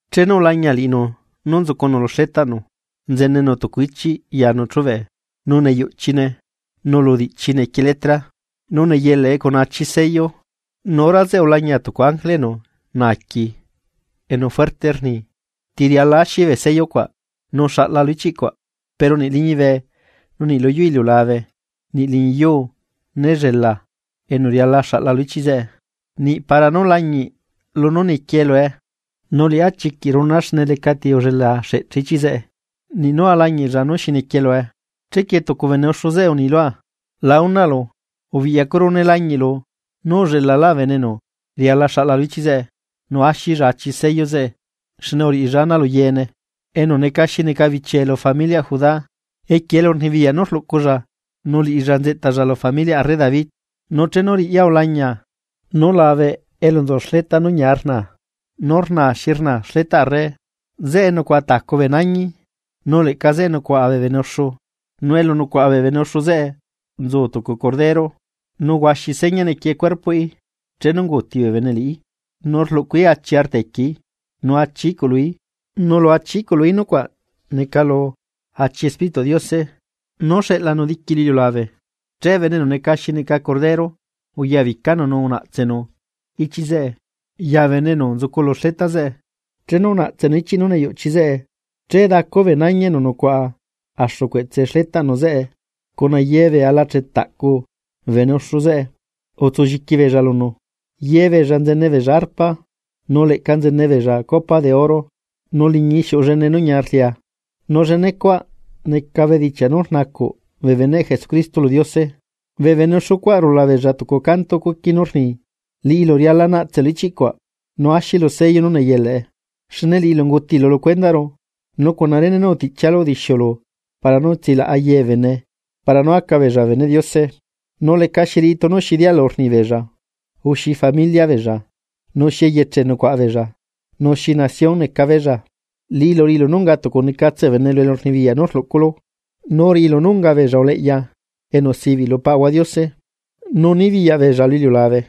Chenu ulañia liꞌinu nú nzucunu lu xletaꞌnu, nzenenu tucu ichiꞌ yanu chube. Nu neyuꞌchine nu lu diꞌchii nequie letra, nu neyelaꞌe cuna achi sello. Nu hora zeꞌe ulañia tucu ángele enu naaqui, enu fuerte rni: ―¿Ti riala axi bee sello cuaꞌ nu xaꞌla lu ichiꞌ cuaꞌ? Pero niꞌ liñibe, nu niꞌ luyuu iliulabe, niꞌ liñi yuu né llela enu riala xaꞌla lu ichiꞌ cuaꞌ, niꞌ para nú lañiꞌ lunú niquie lue. Nu Liꞌá chiquiꞌ runaa xne lecati ullela axeꞌche ichiꞌ zeꞌe niꞌ nú alañiꞌlla nú xi nequie lue. Chequie tucu bee bene uxu zeꞌe uni lua: ―La unaꞌlu. Ubiꞌyacuru nee lañiꞌlu nú ullelala bene enu riala xaꞌla lu ichiꞌ cuaꞌ nu axilla achi sello zeꞌe xne uriꞌilalla ana lu yeene, enu neca xi neca bichie lu familiaꞌ Judá, equie elurnibiyaꞌ nú rluꞌculla nu liꞌilla nzeꞌtalla lu familiaꞌ arre David. Nu chenu riꞌya ulañia, nú labe elu nzu xleta nú ñia rnaa nú rnaa xi rnaa xletaꞌ arre, zeꞌe nucuaꞌa tacu bee nañi, nu leꞌca zeꞌe nucuaꞌa bee bene uxu, nu elu nucuaꞌa bee bene uxu zeꞌe nzu tucu Cordero, nu huaxi seña nequie cuerpoꞌí chenu unguuti bee bene liꞌí, nu rluꞌcuí achi arta equieí nu achi iꞌculuí. Nu lu achi iꞌculuí nucuaꞌ neca lu achi Espírituꞌ Diose nú xeꞌlanu diqui lu iliulabe. Che bene enu neca xi neca Cordero uyabicanu nu unaꞌtsenu ichiꞌ zeꞌe ya bene enu nzucu lu xleta zeꞌe. Chenu unaꞌtsenu ichiꞌ nú neyuꞌchi zeꞌe, che dacu bee nañi enu nucuaꞌa axu cueꞌtse xletaꞌnu zeꞌe cuna ye ala chetaꞌcu bee bene uxu zeꞌe utsulliqui beella lunu. Ye beella nzene beella arpa, nu leꞌca nzene beella copa de oro nu liñii xiuꞌu llene nú ñia rlia, nu llenecuaꞌ neca bedichiaꞌ nú rnacuꞌ bee beneꞌ Jesucristo lu Diose. Bee bene uxu cuaꞌ rula beella tucu canto cuqui nú rni: Liꞌilu riala naꞌtselu ichiꞌ cuaꞌ nu axilu sello nú neyelaꞌe, xne liꞌilu ungutilu lu cuendaꞌru nu cuna rene nú utiꞌchialu udixiulu para nú tsilaꞌa ye bee bene para nú aca beella bee beneꞌ Diose, nu lecaxi riꞌi tunu xi dialu rni beella o xi familia beella nu xi eyeche nucuaꞌa beella, nu xi nación neca beella. Liꞌilu uriꞌilu nú unga tucunecatse bee bene lu elurnibiyaꞌ nú rluꞌculu nu uriꞌilu nú unga beella uleꞌya enu sibiꞌ lu Paꞌahua Diose, nu nibiyaꞌ beella lu iliulabe.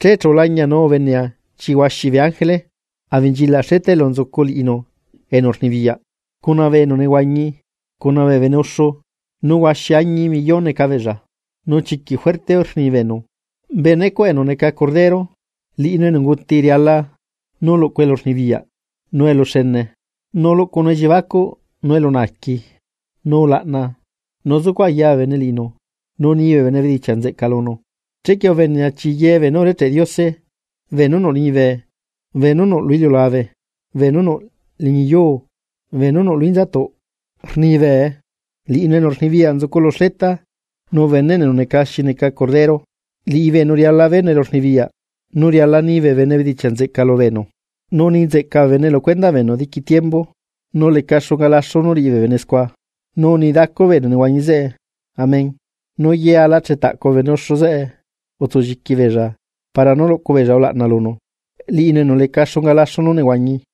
Che chu ulañia nu ubenea chi huaxi bee ángele abenchilaꞌ xleta elu nzucu liꞌinu enu rnibiyaꞌ cuna bee enu nehuañi cuna bee bene uxu. Nu huaxi añi millón neca beella. Nu chiquiꞌ fuerte rni beenu: Benecuaꞌ enu neca xi neca Cordero liꞌinu enu unguti riala nú luꞌcunu elurnibiyaꞌ, nu eluxene; nu luꞌcunu elliebacuꞌ nu elunaaqui, nu ulaꞌna, nu zucuꞌ aya bee bene liꞌinu nu nii bee bene bedichiaꞌ nzeꞌca lunu. Chequie ubenea chii ye beenú urecheꞌ Diose, beenú nuꞌ liñibe, beenú nuꞌ lu iliulabe, beenú nuꞌ liñi yuu, beenú nuꞌ lu inzatuꞌ, rnibee: ¡Liꞌinu enu rnibiyaꞌ nzucu lu xleta, nu beneꞌnu enu neca xi neca Cordero, liꞌibeenu riala beenu elurnibiyaꞌ, nu riala nibee bene bedichiaꞌ nzeꞌca lubeenu, nu ni nzeꞌca bee bene lu cuendaꞌ beenu diqui tiembu, nu leca xunga laxu nú riꞌi bee bene scua! Nu uni dacu bee enu nehuañi zeꞌe: ―¡Amén! Nu ye alachetaꞌcu bee bene uxu zeꞌe utsulliqui beella para nú luꞌcu beella ulaꞌna lunu, Liꞌinu enu leca xunga laxu nú nehuañi.